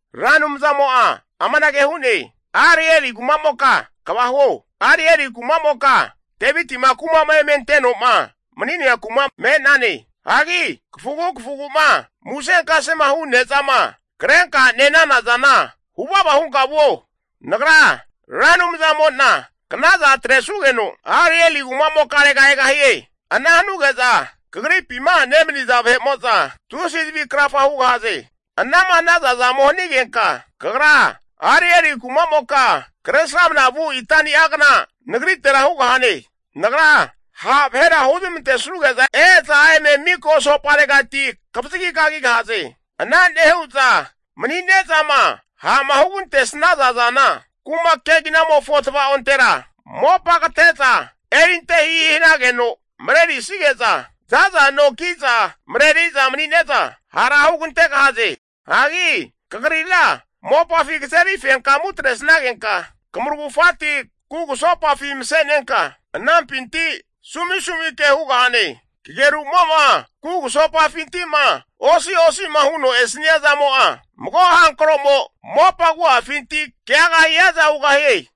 Ra Anumzamo'a amanage hu'ne, Arieli kumamoka kva huo, Arieli kumamoka Devitima kumama eme ante'noma mani'nea kuma me'nane. Hagi kafugu kafugu'ma musenkasema hu nezama krenka nenana zana huvava hunka vuo. Nagra Ra Anumzamo'na knaza atresugeno Arieli kumamokarega egahie. Ana hanuge'za kagripima nemaniza vahe'mo'za tusi zavi krafa hugahaze. Anama hanaza zamo hanigenka kagra Arieli kumamoka kresramna vu itani'agna nagritera hugahane. Nagra ha' vahera huzmantesuge'za e'za eme miko asoparegati kavazagi kagigahaze. Ana nehu'za mani'nezama ha'ma hugantesnaza zana, kuma keginamofo tvaontera mopa kate'za erinte hihi hanageno marerisige'za, zaza no kiza mareriza manine'za hara hugantegahaze. Hagi kagrira mopafi kazeri fenkamu atresnagenka kamuragufati kugusopafi mase'nenka anampinti sumisumi ke hugahane. Kagerumo'ma kugusopafinti'ma osi'osi'ma huno esania zamo'a, mago hankro'mo mopa agu'afinti keaga hiaza hugahie.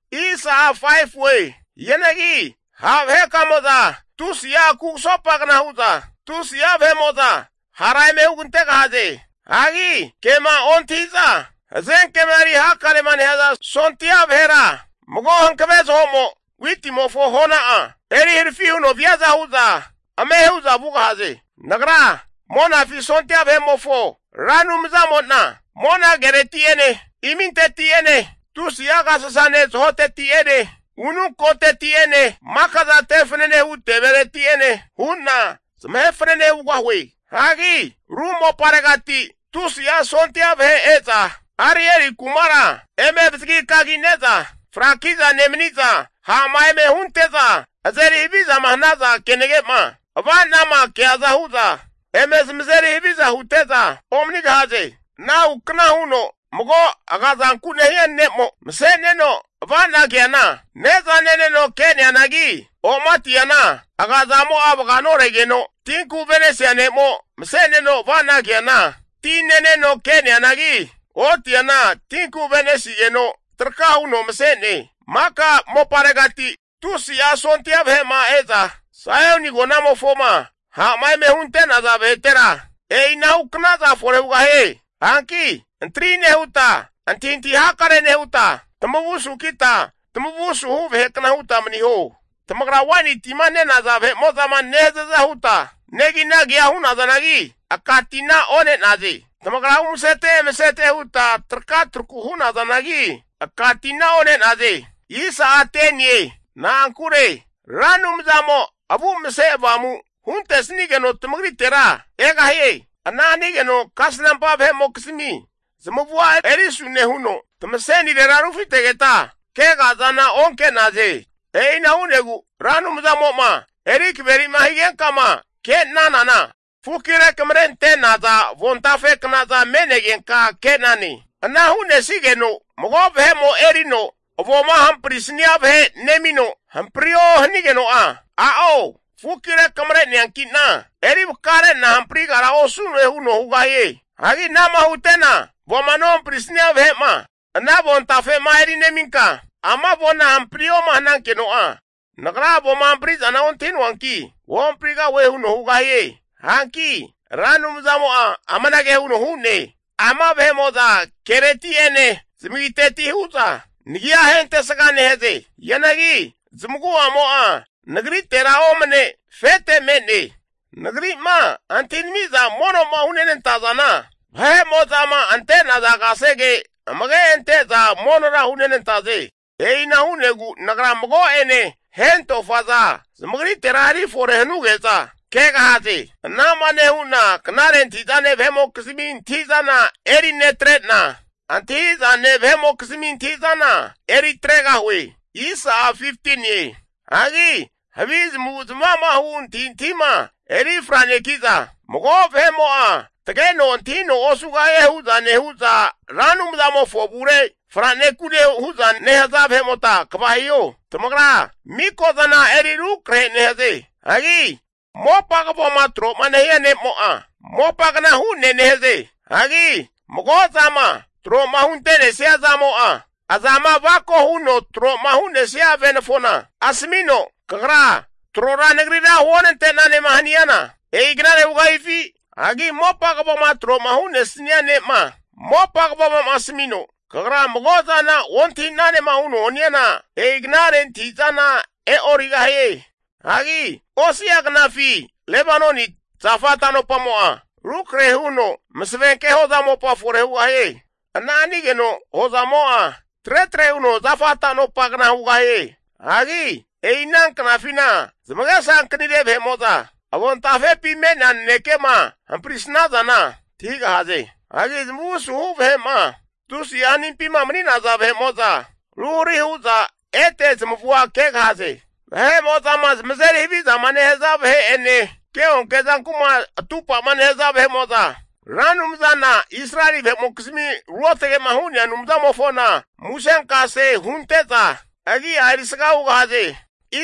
Hianagi ha' vahekamo'za tusi'a kugusopagna hu'za tusi'a vahe'mo'za hara eme hugantegahaze. Hagi kema ontahi'za hazenkema eri hakarema nehaza sondia vahera mago hankave zaho'mo witimofo hona'a eri harafi huno viaza hu'za ame hu'za vugahaze. Nagra Monafi sondia vahe'mofo Ra Anumzamo'na mona kereti'ene, iminti'ene tusi'a agasasane zahoteti'ene ununkoteti'ene maka'za te fanane hu tevereti'ene hu'na zamahe fanene hugahue. Hagi ru moparegati tusi'a sondia vahe e'za Arieli (Jerusalemi) kumara eme avazagi kagine'za, fraki'za nemaniza ha'ma eme hunte'za azeri havizama hanaza zamo'a, kenage'ma ava'na keaza hu'za eme zamazeri haviza hute'za omanigahaze. Anahu kna huno mago agazanku nehia ne'mo mase'neno ava'na keana, ne'za neneno ke'neanagi, o'matiana aga zamo'a vaga noregeno, tinku ave'nesia ne'mo mase'neno ava'na keana, ti neneno ke'neanagi, otiana tinku ave'nesigeno traka huno mase'ne. Maka moparegati tusi'a sondia vahe'ma e'za Saioni agonamofoma ha'ma eme hunte'naza vahetera e'ina huknaza fore hugahie. Hanki antri nehuta antahintahi hakare nehuta, tamavu sukita tamavu asuhu vahekna huta maniho. Tamagra waini tima nenaza vahe'mo'zama nehazaza huta neginagia hunazanagi, aka tina one'naze. Tamagra umasete emeset huta traka traku hu'nazanagi, aka tina one'naze. Na'ankure Ra Anumzamo avu mase avamu huntesigeno tamagritera egahie. Ana hanigeno kasnampa vahe'mokizmi zamavua erisu nehuno tamasenirera rufitegeta kega'zana onke'naze. E'ina hu'negu Ra Anumzamo'ma eri kaveri'ma higenkama kenanana, fuki rekamarente'naza avontafe knaza me'negenka ke'nane. Ana hunesigeno mago vahe'mo erino avoma nehamprisania vahe nemino hamprio hanigeno'a, a'o fuki rekamare neanki'na eri vakare'na hamprigara osu'noe huno hugahie. Hagi ana'ma hutena avoma nohamprisnia vahe'ma ana avontafe'ma eri neminka, ama avona hamprioma hanankeno'a, nagra avoma hampri'zana ontahi noanki'na ohamprigahue huno hugahie. Hanki Ra Anumzamo'a amanage huno hu'ne, ama vahe'mo'za kereti'ene zamagiteti hu'za nagia ahentesga nehaze. Hianagi zamagu'amo'a nagritera omane afete me'ne. Nagri'ma antahi'namiza mono'ma hunenanta zana vahe'mo'zama ante'naza kasege amage ante'za monora hunenantaze. E'ina hu'negu nagra mago'ene hentofaza zamagritera eri fore hanuge'za kegahaze. Anama nehu'na knare antahi'zane vahe'mokizmi antahi'zana eri netre'na, antahi zane vahe'mokizmi antahi'zana eri atregahue. Hagi havi zamavu'zamava'mahu antahintahima eri franeki'za, mago vahe'mo'a tageno antahino osugahie hu'za nehu'za Ra Anumzamofo avure franekune hu'za nehaza vahe'mo'za kva hiho. Tamagra miko zana eri rukrahe nehaze. Hagi mopa kavoma tro'ma nehia ne'mo'a, mopagna hu'ne nehaze. Hagi mago zama tro'ma hunte'nesnia zamo'a, azama avako'ma huno tro'ma hunte'nesnia venafona, asamino kagra trora nagrira huonte'nanema haniana, e'i knare hugahifi? Hagi mopa kavoma tro'ma hu'nesnia ne'ma, mopa kavomo'ma asamino kagra mago'zana ontahi'nanema huno haniana, e'i knare antahi'zana e'origahie. Hagi osi'a knafi Lebanoni zafa tanopamo'a rukrahe huno masavenke hoza mopa fore hugahie. Ana hanigeno hozamo'a tretre huno zafa tanopagna hugahie. Hagi e'i ana knafina zamagesa ankanire vahe'mo'za avontafepi me'nea nanekema hamprisnazana antahigahaze. Hagi zamavu asuhu vahe'ma tusi'a hanimpima mani'naza vahe'mo'za ruhari hu'za ete zamavua kegahaze. Vahe'mozama zamazeri havizama nehaza vahe'ene keonke zanku'ma atupa'ma nehaza vahe'mo'za, Ra Anumzana Israeli vahe'mokizmi ruotage'ma hu'nea Anumzamofona musenkase hunte'za agi'a erisga hugahaze.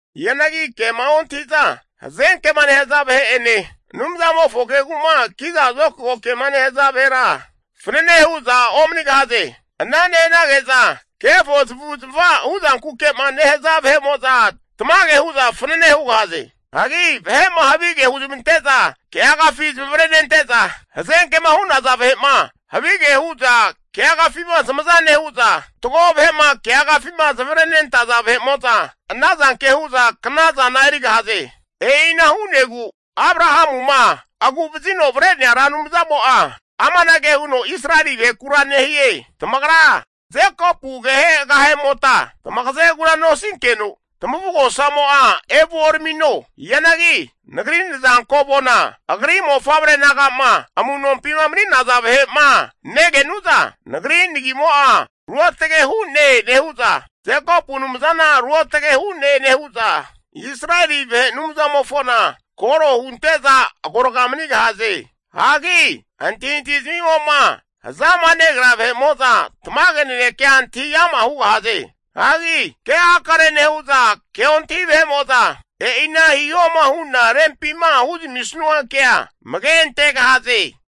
Hianagi kema ontahi'za hazenke'ma nehaza vahe'ene, Anumzamofo kegu'ma kiza zokago kema nehaza vahera fanane hu'za omanigahaze. Ana nehanage'za kefo zamavu'zmava huzankuke'ma nehaza vahe'mo'za tamage hu'za fanane hugahaze. Hagi vahe'ma havige huzmante'za keagafi zamavare nente'za, hazenkema hu'naza vahe'ma havige hu'za keagafima zamaza nehu'za, fatgo vahe'ma keagafima zamavarenentaza vahe'mo'za ana zanke hu'za knazana erigahaze. E'ina hu'negu Abrahamuma agu'vazino avre'nea Ra Anumzamo'a amanage huno Israeli vahekura nehie, tamagra Jekopu agehe agehemota tamagazegura nosinkeno tamavugosamo'a evuoramino. Hianagi Nagri nazanko avoma agri mofavre naga'ma amu'nompima mani'naza vahe'ma negenu'za, Nagri nagimo'a ruotge hu'ne nehu'za, Jekopu Anumzana ruotage hu'ne nehu'za, Israeli vahe Anumzamofona koro hunte'za agorga manigahaze. Hagi antahintahi zamimo'ma hazama negrea vahe'mo'za tamage nanekea antahi ama' hugahaze. Hagi ke hakare nehu'za ke ontahi vahe'mo'za e'ina hihoma hu'na rempima huzamisnua kea amage antegahaze.